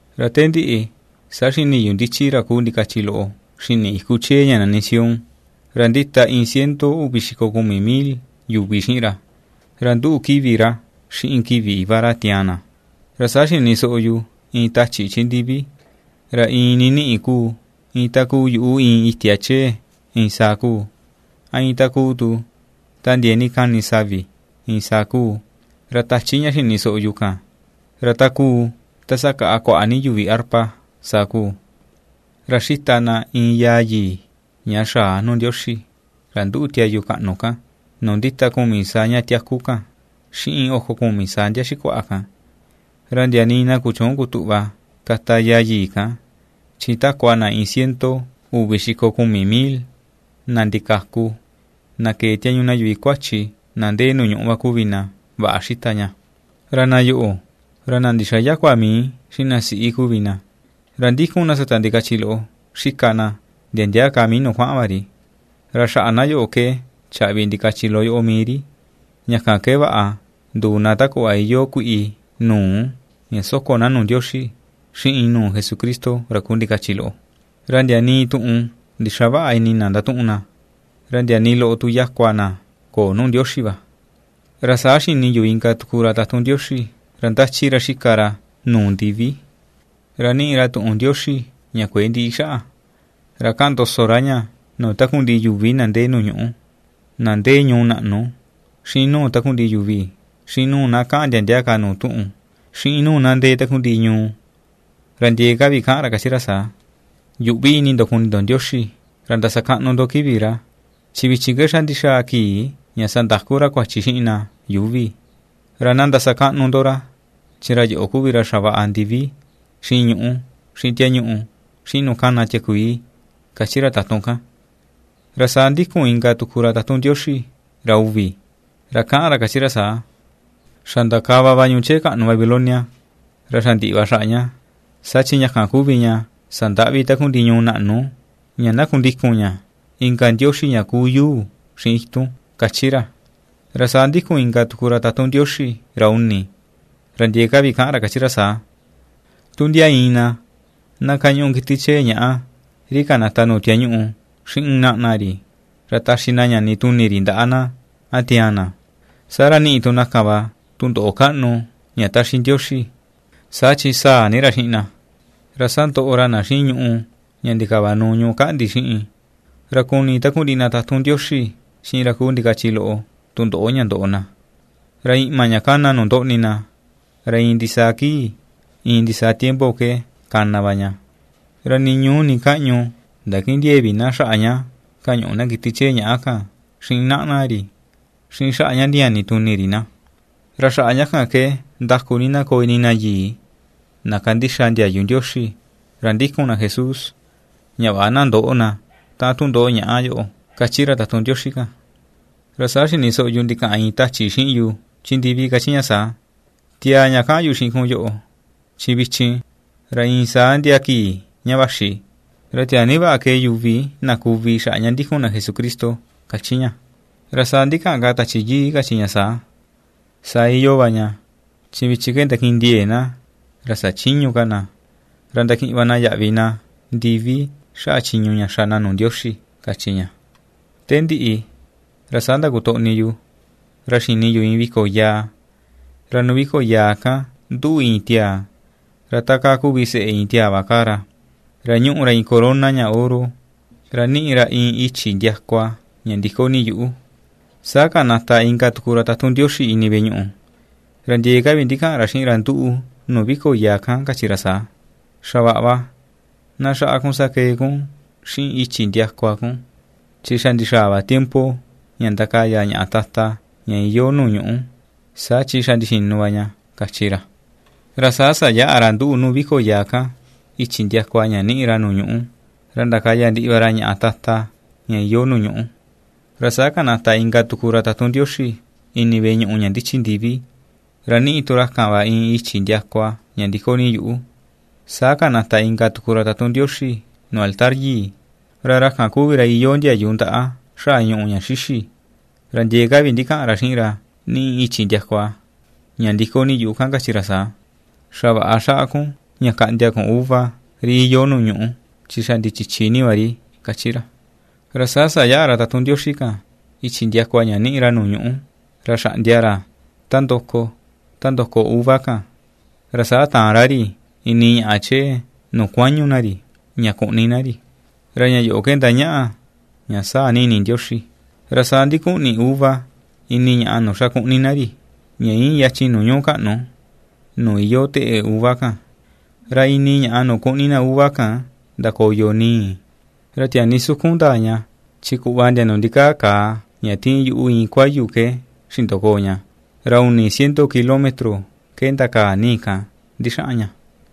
Ra te ndiꞌi, saa xini yu ndichi ra kuu ndikachi loꞌo xini iku chee ña nani Sión, ra ndita iin ciento uvi xiko kumi mil yuvi xiꞌin ra, ra nduꞌu kivi ra xiꞌin kivi Iva ra tiaan na. Ra saa xini soꞌo yu iin tachi chi ndivi, ra iin niniꞌi kuu iin ta kuu yuꞌu iin itia chee iin saa kuu, a iin ta kuu tu ta ndiee ni kani savi iin saa kuu, ra tachi ña xini soꞌo yu kan, ra ta kuu ta ^sakaꞌa kuaꞌa ni yuvi arpa, saa kuu. Ra ^xita na iin yaa yii, ña xaa nuu Ndioxi, ra nduꞌu tiayu kaꞌnu kan nuu ndita kumi saa ña tiaku kan xiꞌin oko kumi saa ndia xikuaꞌa kan, ra ndia nii na kuchüun kutuꞌva kata yaa yii kan, chi takua na iin ciento uvi xiko kumi mil, na ndikaku, na kee tiañu na yuvi kuachi na ndee nuu ñuꞌu va kuvi na vaꞌa xita ña. Ra na yoꞌo, ra na ndixayäkua mii xiꞌin na siꞌi kuvi na; ra ^ndikun na sata ndikachi loꞌo xika na ndia ndia ka mii nuu kuaꞌan va ri. Ra xaꞌa na yoꞌo ke chaꞌvi ndikachi loꞌo yoꞌo mii ri, ña kan ke vaꞌa nduu na ta kuꞌva iyoo kuiꞌi nuu ña ^soko na nuu Ndioxi xiꞌin nuu Jesucristo ra kuu ndikachi loꞌo. Ra ndia nii tuꞌun ndixaväꞌa ini na ndatuꞌun na, ra ndia nii loꞌo tu yakua na köo nuu Ndioxi va. Ra saa xini yu inka tuku ra tatun Ndioxi, ra ^ndachi ra ^xika ra nuu ndivi, ra ^niꞌi ra tuꞌun Ndioxi ña kuëe ndiꞌi xaꞌa. Ra kaꞌan ndoso ra ña nuu takundiꞌi yuvi na ndee nuu ñuꞌú: na ndee ñuu naꞌnu, xiꞌin nuu takundiꞌi yuvi, xiꞌin nuu na kaꞌan ndia ndia ka nuu tuꞌun, xiꞌin nuu na ndee takundiꞌi ñuu. Ra ndiee ka vi ^kaꞌan ra kachi ra saa: ―Yuꞌvi ini ndo kuni ndo Ndioxi ra ndasakaꞌnu ndo kivi ra, chi vichin ke xa ndixaa kii ña sandaku ra kuachi xiꞌin na yuuvi, ra na ndasakaꞌnu ndo ra, chi ra yoꞌo kuvi ra xavaꞌa ndivi, xiꞌin ñuꞌú, xiꞌin tiañuꞌu, xiꞌin nuu kana tiakuii ―^kachi ra tatun kan. Ra saa ^ndíku̱n inka tuku ra tatun Ndioxi, ra uvi, ra ^kaꞌan ra kachi saa: ―Xa ndakava va ñuu chee kaꞌnu Babilonia, ra xa ndiꞌi va xaꞌa ña, saa chi ña kan kuvi ña sandaꞌvi takundiꞌi ñuu naꞌnu ña na kundikun ña inka ndioxi ña kuu yuu xiꞌin itun ―^kachi ra. Ra saa ^ndíku̱n inka tuku ra tatun Ndioxi ra uni, ra ndiee ka vi kaꞌan ra kachi ra saa: ―Tu ndia iin na, na kañuꞌu kiti chee ñàꞌa ri kanata nuu tiañuꞌu, xiꞌin naꞌna ri, ra taxi na ñani tuni ri ndaꞌa na, a tiaan na, saa ra niꞌi tu na kan va tundoꞌo kaꞌnu ña taxi Ndioxi, saa chi sáa̱ ni ra xiꞌin na, ra sandoꞌo ra na xiꞌin ñùꞌù ña ndikavanuu ñuꞌú kaꞌndi xiꞌin, ra kuni takundiꞌi na tatun Ndioxi xiꞌin ra kuu ndikachi loꞌo tundoꞌo ña ndoꞌo na. Ra iꞌma ña ^kana nuu ndoꞌni na, ra iin ndisaa kii, iin ndisaa tiempo ke kana va ña, ra nii ñuu nii kaꞌñu ndakindiëe vi na xaꞌa ña kañuꞌu na kiti chee ñàꞌa kan, xiꞌin naꞌna ri, xiꞌin xaꞌa ña ndiñani tuni ri na. ¡Ra xaꞌa ña kan ke ndaku ni na koo ini na yii, na ^kandixa ndiayu Ndioxi, ra ^ndikun na Jesús, ña vaꞌa na ndöꞌo na taꞌan tundoꞌo ñaꞌa yoꞌo! ―kachi ra tatun Ndioxi kan. Ra saa xini soꞌo yu ndikaꞌan iin tachi xiꞌin yu chi ndivi kachi ña saa: ―Tiaa ña kaꞌan yu xiꞌin kun yoꞌo: “Chi vichin, ra iin saa ndia kii ña vaxi, ra tiaa ni vaꞌa kee yuvi na kuvi xaꞌa ña ndikun na Jesucristo”, ―kachi ña. Ra saa ndikaꞌan ka Tachi Yii kachi ña saa: ―Saa iyoo va ña, chi vichin ke ndakindiee na, ra sachïñu ka na, ra ndakiꞌin va na yaꞌvi na ndivi xaꞌa chiñu ña xa na nuu Ndioxi ―kachi ña. Te ndiꞌi, ra saa ndakutoꞌni yu, ra xini yu iin viko yaa, ra nuu viko yaa kan nduꞌu iin tiaa, ra takaa kuvi seꞌe iin tiaa va kaa ra, ra ñúꞌu ra iin corona ña oro, ra niꞌi ra iin ichi ndiakua ña ndi̱kó ni yuꞌu. Saa kanata inka tuku ra tatun Ndioxi ini veꞌe ñuꞌu, ra ndiee ka vi ndikaꞌan ra xiꞌin ra nduꞌu nuu viko yaa kan kachi ra saa: ―Xa vaꞌa va, na xaꞌa kun sakee kun xiꞌin ichi ndiakua kun, chi xa ndixaa va tiempo ña ndakaya ñaꞌa tata ña iyoo nuu ñuꞌú, saa chi xa ndixinu va ña ―kachi ra. Ra saa sayaꞌa ra nduꞌu nuu viko yaa kan, ichi ndiakua ña ^niꞌi ra nuu ñuꞌu, ra ndakaya ndiꞌi va ra ñaꞌa tata ña iyoo nuu ñuꞌu. Ra saa kanata inka tuku ra tatun Ndioxi ini veꞌe ñuꞌu ña ndichi ndivi, ra ^niꞌi tu ra kan va iin i̱chi̱ ndiakua ña ndi̱kó ni yuꞌu. Saa kanata inka tuku ra tatun Ndioxi nuu altar yii, ra ra kan kuvi ra iyoo ndiayu ndaꞌa xaꞌa ñùꞌù ña xíxî, ra ndiee ka vi ndikaꞌan ra xiꞌin ra ^niꞌi ichi ndiakua ña ndi̱kó ni yuꞌu kan kachi ra saa: ―Xa vaꞌa xaꞌa kun ña kaꞌndia kun uva ri iyoo nuu ñuꞌú, chi xa ndichichi ni va ri ―kachi ra. Ra saa sayaꞌa ra tatun Ndioxi kan, ichi ndiakua ña niꞌi ra nuu ñuꞌu, ra xaꞌndia ra ta ndoko, ta ndoko uva kan, ra saa taan ra ri ini ñaꞌa chee nuu kuañu na ri, ña kuꞌni na ri, ra ña yoꞌo ke ndañaꞌa, ña sáa̱ ní ini Ndioxi. Ra saa ndikuꞌni uva ini ñaꞌa nuu xa kuꞌni na ri, ña íin yachin nuu ñuu kaꞌnu, nuu iyoo teꞌe uva kan, ra ini ñaꞌa nuu kuꞌni na uva kan ndakoyo ni̱i̱. Ra tiaa ni sukun ndaa ña chi kuꞌva ndia nuu ndikaa kàà ña tiin yuꞌu iin kuayu ke xindokoo ña; ra uni ciento kilómetro ke ndakaa ni̱i̱ kan ndixaꞌan ña.